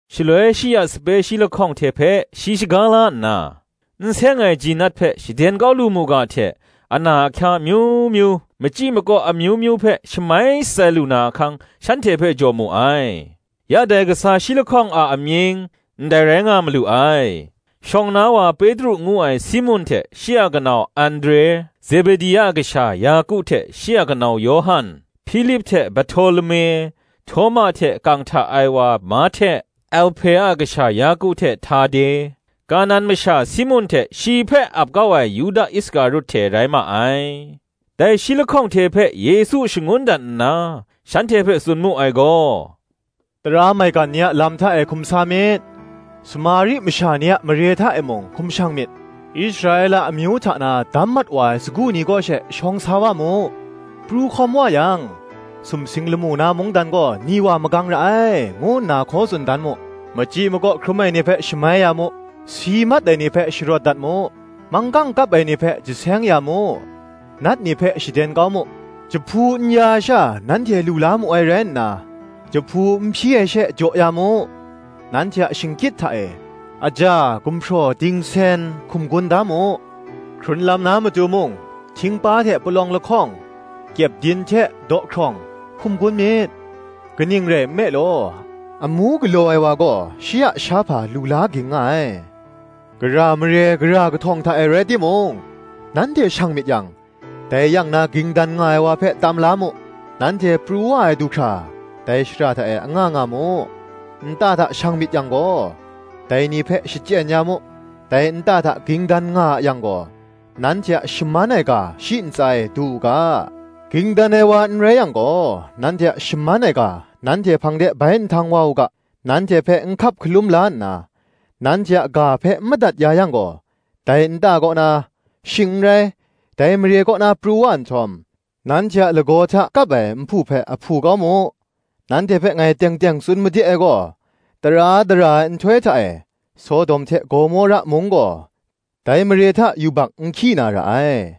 Shaloi shi a sape shi lahkawng hte hpe shi shaga la nna, n seng ai ji nat ni hpe shaden kau lu mu ga hte, ana ahkya amyu myu, machyi makaw amyu myu hpe shamai shatsai lu na ahkang, shanhte hpe jaw mu ai. Ya dai kasa shi lahkawng a amying, ndai rai nga malu ai: shawng na wa Petru ngu ai Simun hte shi a kanau Andre; Zebedi a kasha Yaku hte shi a kanau Yawhan; Hpilip hte Barhtolume; Htawma hte kang hta ai wa Mahte; Alhpe a kasha Yaku hte Htade; Kanan masha Simun hte shi hpe ap kau ai Yuda Iskarut hte rai ma ai. Dai shi lahkawng hte hpe Yesu shangun dat nna, shanhte hpe tsun mu ai gaw, “Tara maigan ni a lam hta e hkum sa myit; Samari masha ni a mare hta e mung hkum shang myit: Israela amyu hta na dam mat wa ai sagu ni kaw she shawng sa wa mu. Pru hkawm wa yang, ‘Sumsing lamu na mungdan gaw ni wa magang ra ai,’ ngu nna hkaw tsun dan mu. Machyi makaw hkrum ai ni hpe shamai ya mu; si mat ai ni hpe sharawt dat mu; manggang kap ai ni hpe jaseng ya mu, nat ni hpe shaden kau mu; jahpu n ya ai sha nanhte lu la mu ai rai nna, jahpu n hpyi ai she jaw ya mu. Nanhte a shingkyit hta e, aja, gumhpraw, dingsen, hkum gun da mu; hkrun lam na matu mung htingpa hte palawng lahkawng, kyepdin hte dawhkrawng, hkum gun myit: kaning rai nme law, amu galaw ai wa gaw shi a shahpa lu la ging nga ai. Gara mare, gara kahtawng hta e rai timung, nanhte shang myit yang, dai yang na ging dan nga ai wa hpe tam la mu: nanhte pru wa ai du hkra, dai shara hta e anga nga mu. Nta hta shang myit yang gaw, dai ni hpe shachyen ya mu: dai nta hta ging dan nga a yang gaw, nanhte a shaman ai ga shi ntsa e du u ga; ging dan ai wa n rai yang gaw, nanhte a shaman ai ga nanhte hpang de bai nhtang wa u ga. Nanhte hpe n hkap hkalum la nna, nanhte a ga hpe n madat ya yang gaw, dai nta kaw na, shing n rai, dai mare kaw na pru wa nhtawm, nanhte a lagaw hta kap ai nhpu hpe ahpu kau mu. Nanhte hpe ngai teng teng tsun made ai gaw, tara dara ai nhtoi hta e, Sodom hte Gomora mung gaw, dai mare hta yubak nhkyi na ra ai.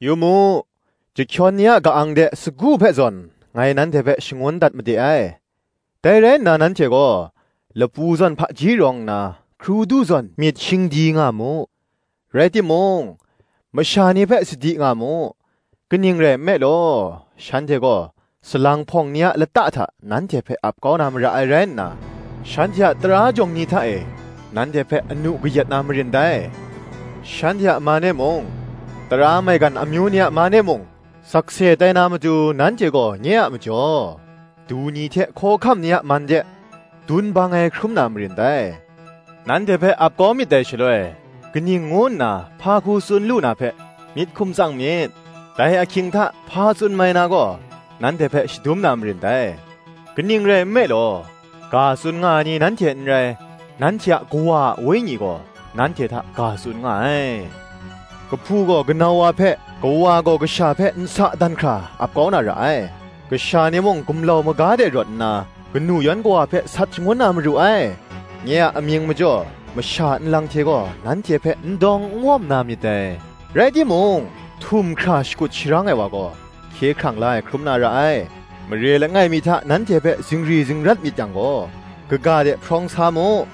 Yu mu, chyahkyawn ni a ka-ang de sagu hpe zawn, ngai nanhte hpe shangun dat made ai: dai rai nna nanhte gaw; lapu zawn hpaji rawng nna, hkrudu zawn myit shingdi nga mu. Rai timung, masha ni hpe sadi nga mu: kaning rai nme law, shanhte gaw salang hpawng ni a lata hta nanhte hpe ap kau na mara ai rai nna, shanhte a tara jawng ni hta e nanhte hpe anu kayat na marin dai. Shanhte a man e mung, tara maigan amyu ni a man e mung, sakse tai na matu nanhte gaw nye a majaw, du ni hte hkawhkam ni a man de, dun bang ai, hkrum na marin dai. Nanhte hpe ap kau myit dai shaloi, kaning ngu nna, hpa hku tsun lu na hpe, myit hkum tsang myit: dai ahkying hta, hpa tsun mai na gaw, nanhte hpe shadum na marin dai: kaning rai nme law, ga tsun nga ai ni nanhte n rai, nanhte a Kawa a Wenyi gaw nanhte hta ga tsun nga ai. Kahpu gaw kanau wa hpe, kawa gaw kasha hpe nsa dan hkra ap kau na ra ai; kasha ni mung gumlau maga de rawt nna, kanu yan kawa hpe sat shangun na maru ai. Nye a amying majaw masha nlang hte gaw nanhte hpe n dawng n wawm na myit dai: rai timung, htum hkra shakut sharang ai wa gaw, hkye hkrang la ai hkrum na ra ai. Mare langai mi hta nanhte hpe zingri zingrat myit yang gaw, kaga de hprawng sa mu: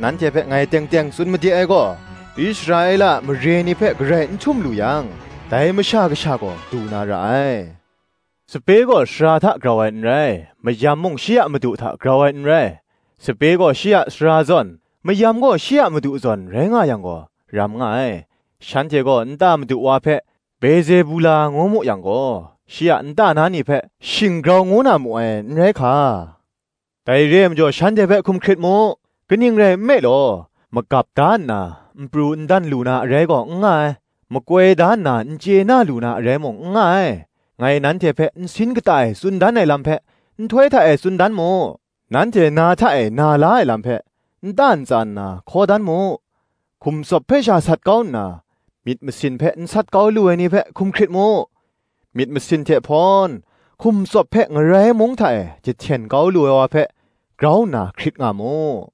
nanhte hpe ngai teng teng tsun made ai gaw, Israela a mare ni hpe garai n htum lu yang, dai Masha Kasha gaw du na ra ai. Sape gaw sara hta, grau ai n rai; mayam mung shi a madu hta grau ai n rai. Sape gaw shi a sara zawn, mayam gaw shi a madu zawn rai nga yang gaw, ram nga ai: shanhte gaw nta madu wa hpe Bezebula ngu mu yang gaw, shi a nta na ni hpe, shing grau ngu na mu ai, n rai hka! Dai re ai majaw shanhte hpe hkum hkrit mu: kaning rai nme law, magap da nna, n pru n dan lu na arai gaw n nga ai; makoi da nna n chye na lu na arai mung n nga ai. Ngai nanhte hpe nsin kata e tsun dan ai lam hpe, nhtoi hta e tsun dan mu: nanhte na hta e na la ai lam hpe, nta ntsa nna hkaw dan mu. Hkum tsawp hpe sha sat kau nna, myit masin hpe n sat kau lu ai ni hpe hkum hkrit mu: myit masin hte hpawn hkum tsawp hpe ngarai mung hta e jahten kau lu ai wa hpe grau nna hkrit nga mu.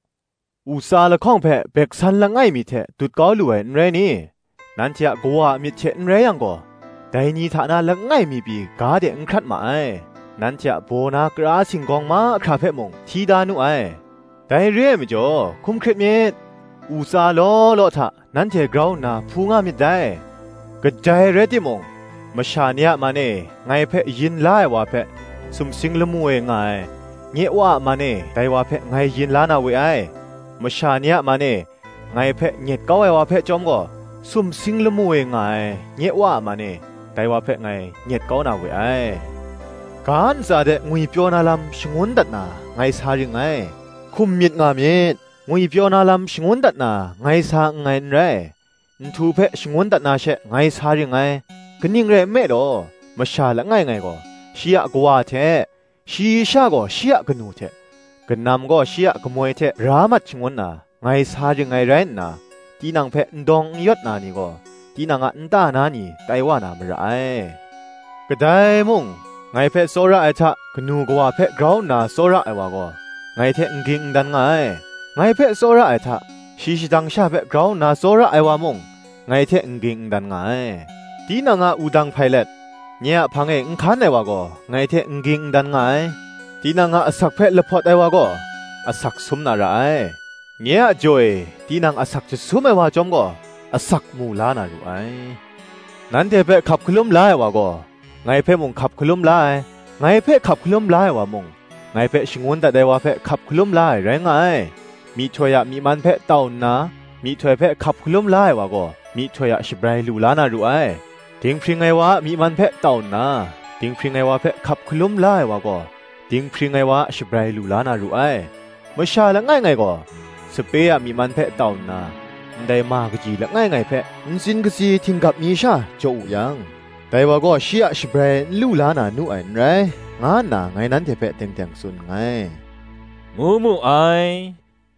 U tsa lahkawng hpe gumhpraw lap mi hte dut kau lu ai, n rai ni? nanhte a Kawa a myit hte n rai yang gaw, dai ni hta na langai mi pyi ga de n hkrat ma ai. Nanhte a baw na kara singgawng mahkra hpe mung, hti da nu ai. Dai re ai majaw, hkum hkrit myit: u tsa law law hta nanhte grau nna hpu nga myit dai. Kadai rai timung, masha ni a man e ngai hpe yin la ai wa hpe, Sumsing lamu e nga ai, nye Wa a man e dai wa hpe ngai yin la na we ai. masha ni a man e ngai hpe nyet kau ai wa hpe chyawm gaw, sumsing lamu e nga ai, nye Wa a man e, dai wa hpe ngai nyet kau na we ai. Ga ntsa de ngwipyaw na lam shangun dat na ngai sa ring ngai, hkum myit nga myit: ngwipyaw na lam shangun dat na ngai sa nngai n rai, nhtu hpe shangun dat na she ngai sa ring ngai. Kaning rai nme law, masha langai ngai gaw shi a kawa hte, shayi sha gaw shi a kanu hte, kanam gaw shi a kamoi hte bra mat shangun na, ngai sa ring ngai rai nna, tinang hpe n dawng n yawt na ni gaw, tinang a nta na ni tai wa na mara ai. Kadai mung, ngai hpe tsawra ai hta, kanu kawa hpe grau nna tsawra ai wa gaw, ngai hte n ging n dan nga ai: ngai hpe tsawra ai hta, shayi shadang sha hpe grau nna tsawra ai wa mung, ngai hte n ging n dan nga ai. Tinang a wudang hpai let, nye a hpang e n hkan ai wa gaw, ngai hte n ging n dan nga ai. Tinang a asak hpe lahpawt ai wa gaw, asak sum na ra ai: nye a jaw e, tinang asak jasum ai wa chyawm gaw, asak mu la na ru ai. Nanhte hpe hkap hkalum la ai wa gaw, ngai hpe mung hkap hkalum la ai; ngai hpe hkap hkalum la ai wa mung, ngai hpe shangun dat ai wa hpe hkap hkalum la ai rai nga ai. Myihtoi a myi man hpe tau nna myihtoi hpe hkap hkalum la ai wa gaw, myihtoi a shabrai lu la na ru ai; dinghpring ai wa a myi man hpe tau nna, dinghpring ai wa hpe hkap hkalum la ai wa gaw, dinghpring ai wa a shabrai lu la na ru ai. Masha langai ngai gaw, sape a myi man hpe tau nna, ndai ma kaji langai ngai hpe, ntsin katsi htinggap mi sha jaw wu yang, dai wa gaw shi a shabrai n lu la na nu ai n rai, nga nna ngai nanhte hpe teng teng tsun nngai,” ngu mu ai.